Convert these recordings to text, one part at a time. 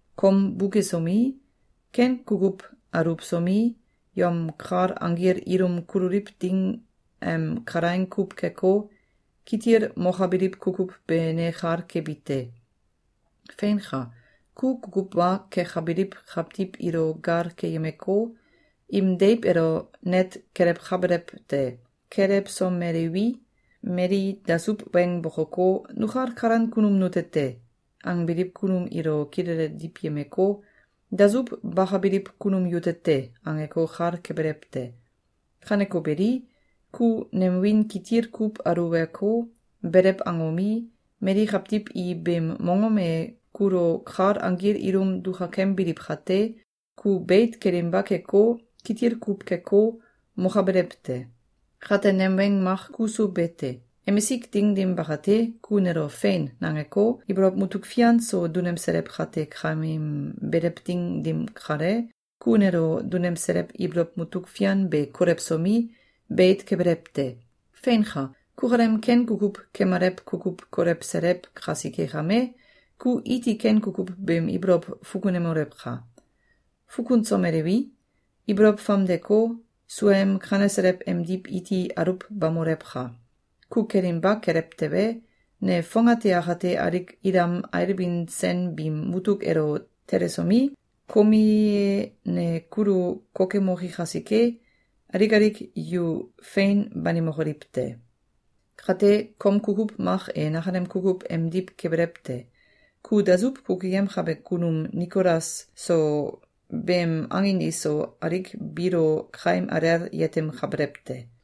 ‘Kom bukesomi, ken kukuw aluwsomi, yom kal anggil ilum kululiw ding em kalaing kuw keko, kitil mokabiliw kukuw be ne kal kebi te. Feinka! Ku kukuw wa kekabiliw kawtiw ilo gal keyemeko, im deiw elo net kelewkabelew te. Kelewsomelewi, mali dasuw weng bokoko, ‘Nukal kalan kunum nute te!’, angbiliw kunum ilo kilele diwyemeko, ‘Dasuw bakabiliw kunum yute te!’, angeko, kal kebelew te. Kaneko beli, ku nem wiin kitil kuw aluweko, belew angomi, mali kawtiw i beem mongom e kulo kal anggil ilum dukakembiliw kate, ku beit kelinba keko, kitil kuw keko, mokabelew te. Kate, nem weng mak kuso be te. Emisik ding dim bakate, ku nelo ‘Fein!’, nangeko, ibolow mutuk fian so dunemselew kate kameem belew ding dim kale, ku nelo dunemselew ibolow mutuk fian be kolewsomi, beit kebelew te. Feinka! Kukalem ken kukuw kemalew kukuw kolewselew kasike kame, ku iti ken kukuw beem ibolow fukunemolewka! Fukunsomelewi, ibolow famdeko, suaem kaneselew emdiw iti aluwbamolewka! Ku kelinba kelew tewe, ne fongate akate alik ilam ailbin sen biim mutuk elo telesomi, komie ne kulu kokemoki kasike, alik alik yu fein banimokoliw te. Kate, kom kukuw mak e nakalem kukuw emdiw kebelew te. Ku dasuw kukuyemkabe kunum Nikolas so beem angin iso alik biilo kaim alel yetemkabelew te.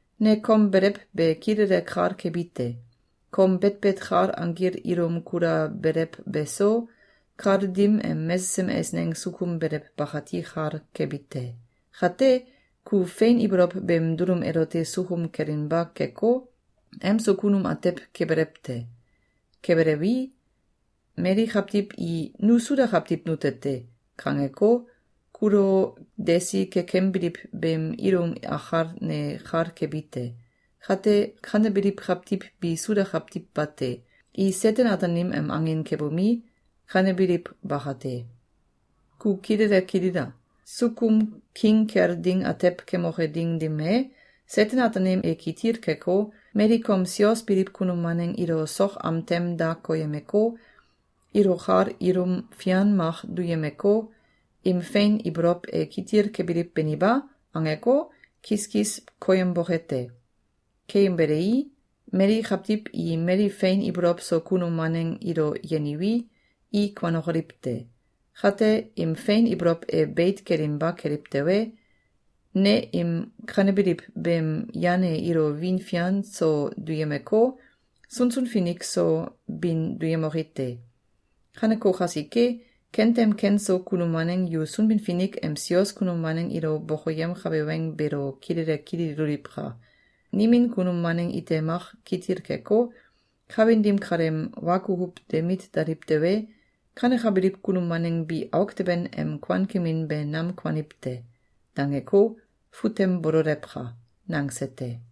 ‘Ne kom belew be kilele kal kebi te. Kom betbet kal anggil ilum kulabelew beso, kal dim em mesesem eisneng sukum belew bakati kal kebi te. Kate, ku fein ibolow beem dulum elote sukum kelinba keko, emso kunum atew kebelew te. Kebelewi, mali kawtiw i ‘Nu Suda kawtiw nute te!’, kangeko, kulo desi kekembiliw beem ilum akal ne kal kebi te. Kate, kanebiliw kawtiw bi Suda kawtiw bate. I Seten-Ataanim em angin kebomi, kanebiliw bakate. Ku kilele kilila! Sukum king kel ding atew kemoke ding dim e, Seten-Ataanim e kitil keko, mali kom sios biliw kunum waneng ilo sok am tem da koyemeko, ilo kal ilum fian mak duyemeko, ‘Im fein ibolow e kitil kebiliw beni ba?’, angeko, kiskis koyemboke te. Keyembelei, mali kawtiw i mali fein ibolow so kunum waneng ilo yeniwi, i kuanokoliw te. Kate, im fein ibolow e beit kelinba keliw tewe, ne im kanebiliw beem yan e ilo wiin fian so duyemeko, sunsun finik so bin duyemoki te. Kaneko kasike, kentem ken so kunum waneng yu Sunbin-Finik em sios kunum waneng ilo bokoyemkabe weng beelo kilele kililoliwka! Nimin kunum waneng ite mak kitil keko, kawin dim kaleem wa kukuw de mit daliw tewe, kanekabiliw kunum waneng bi auk teben em kuankemin be nam kuaniw te.’, dangeko, fut tem bololewka!”, nangse te.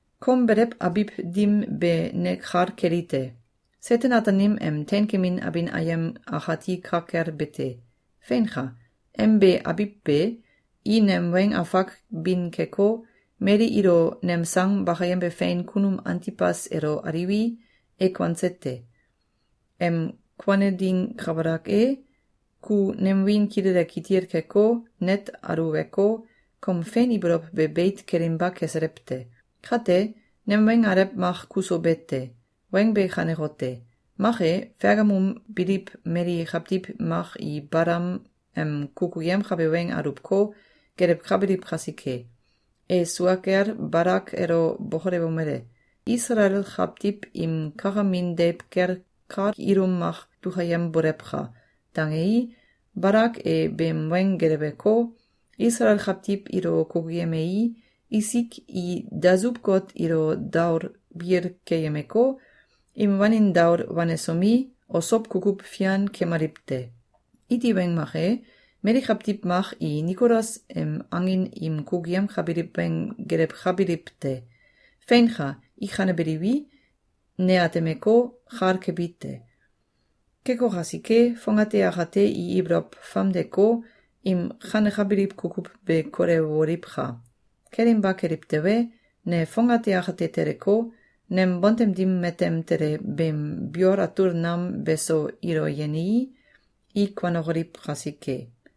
Kom belew abiw dim be ne kal keli te. Seten-Ataanim em teinkemin abin ayem akati ka kel be te. Feinka! Em be abiw be, i nem weng afak bin keko, mali ilo nem sang bakayembe fein kunum Antibas elo aliwi, e kuanse te. Em kuane ding kabalak e, ku nem wiin kilele kitil keko, net aluweko, kom fein ibolow be beit kelinba keselew te. Kate, nem weng alew mak kuso be te. Weng be kanekote: Mak e, Fegamum biliw mali kawtiw mak i Balam em kukuyemkabe weng aluwko, gelewkabiliw kasike. E sua kel Balak elo bokolewomele: “Isalael kawtiw im kakamin deiw kel kal ilum mak dukayembolewka!”, dangei, Balak e beem weng geleweko, Isalael kawtiw ilo kukuyemei, isik i dasuw-got ilo daol bil keyemeko, im wanin daol wanesomi, osow kukuw fian kemaliw te. Iti weng mak e, mali kawtiw mak i Nikolas em angin im kukuyemkabiliw weng gelewkabilw te. Feinka! I kanebiliwi, ne atemeko, kal kebi te. Keko kasike, fongate akate i ibolow famdeko, im kanekabiliw kukuw be kolewoliwka! Kelinba keliw tewe, ne fongate akate teleko, nem bontem dim matem tele beem biol atul nam beso ilo yenii, i kuanokoliw kasike.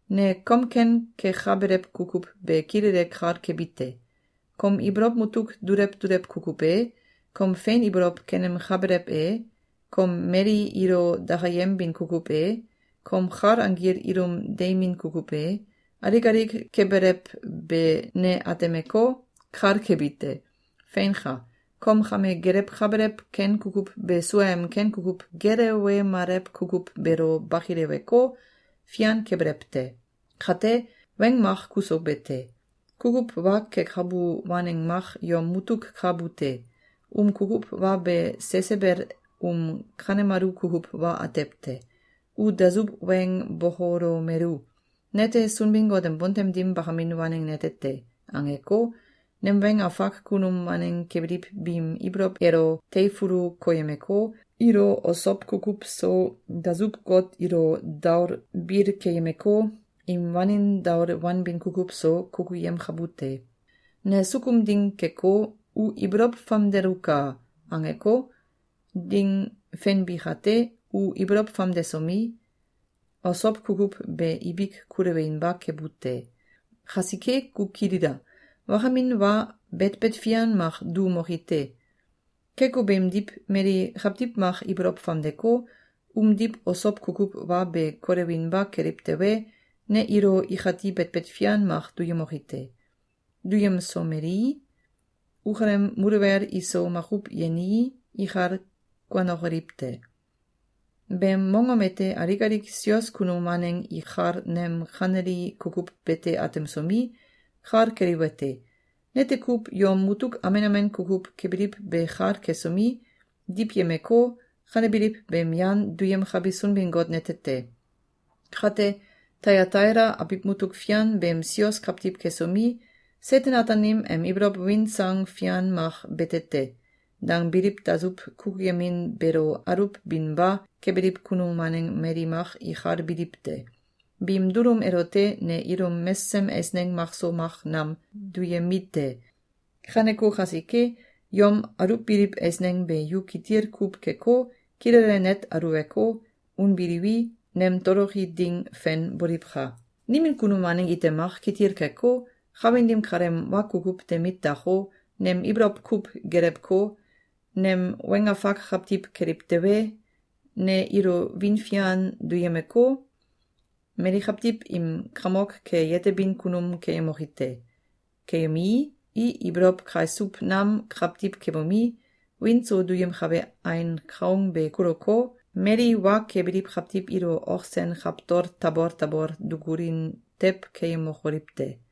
‘Ne kom ken kekabelew kukuw be kilele kal kebi te. Kom ibolow mutuk dulew dulew kukuw e, kom fein ibolow kenemkabelew e, kom mali ilo dakayembin kukuw e, kom kal anggil ilum deimin kukuw e, alik alik kebelew be ne atemeko, kal kebi te. Feinka! Kom kame gelewkabelew ken kukuw be suaem ken kukuw gelewemalew kukuw beelo bakileweko, fian kebelew te. Kate, weng mak kuso bete te. Kukuw wa kekabu waneng mak yom mutuk ka bu te. Um kukuw wa be Sesebel um kanemalu kukuw wa atew te. U dasuw weng bokolomelu: ‘Nete Sunbin-Got em bontem dim bakamin waneng nete te!’, angeko, nem weng afak kunum waneng kebiliw biim ibolow elo teifulu koyemeko, ilo osow kukuw so, dasuw-got ilo daol bil keyemeko, im wanin daol wanbin kukuw so, kukuyemkabu te. Ne sukum ding keko, ‘U ibolow famdeluka!’, angeko, ding fenbi kate, u ibolow famdesomi, osow kukuw be ibik kulewinba kebu te. Kasike, ku kilila! Wakamin wa betbet fian mak duumoki te. Keko beemdiw, mali kawtiw mak ibolow famdeko, umdiw osow kukuw wa be kolewinba keliw tewe, ne ilo ikati betbet fian mak duyemoki te. Duyemsomelii, ukalem muluwel iso makuw yenii, ikal kuanokoliw te. Beem mongom ete alik alik sios kunum waneng ikal nem kaneli kukuw bete atemsomi, kal keliwete: Nete kuw yom mutuk amen amen kukuw kebiliw be kal kesomi, diwyemeko, kanebiliw beem yan duyemkabi Sunbin-Got nete te. Kate Tayataila abiw mutuk fian beem sios kawtiw kesomi, ‘Seten-Ataanim em ibolow win sang fian mak bete te!’, dangbiliw dasuw kukuyemin beelo aluwbinba kebiliw kunum waneng mali mak ikal biliw te. Biim dulum elote ne ilum mesesem eisneng makso mak nam duyemi te. Kaneko kasike, yom aluwbiliw eisneng be yu kitil kuw keko, kilele net aluweko, unbiliwi, nem toloki ding fen boliwka! Nimin kunum waneng ite mak kitil keko, kawin dim kaleem wa kukuw de mit dako, nem ibolow kuw gelewko, nem weng afak kawtiw keliw tewe, ne ilo wiin fian duyemeko, mali kawtiw im kamok ke yetebin kunum keyemoki te. Keyemii, i ibolow kaisuw nam kawtiw kebomi, wiin so duyemkabe ain kaung be kuluko, mali wa kebiliw kawtiw ilo ok sen kawtol tabol tabol dukulin tew keyemokoliw te.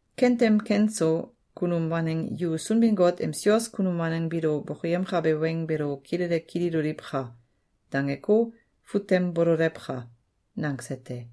Kentem ken so kunum waneng yu Sunbin-Finik em sios kunum waneng biilo bokoyemkabe weng beelo kilele kililoliwka!’, dangeko, fut tem bololewka!”, nangse te.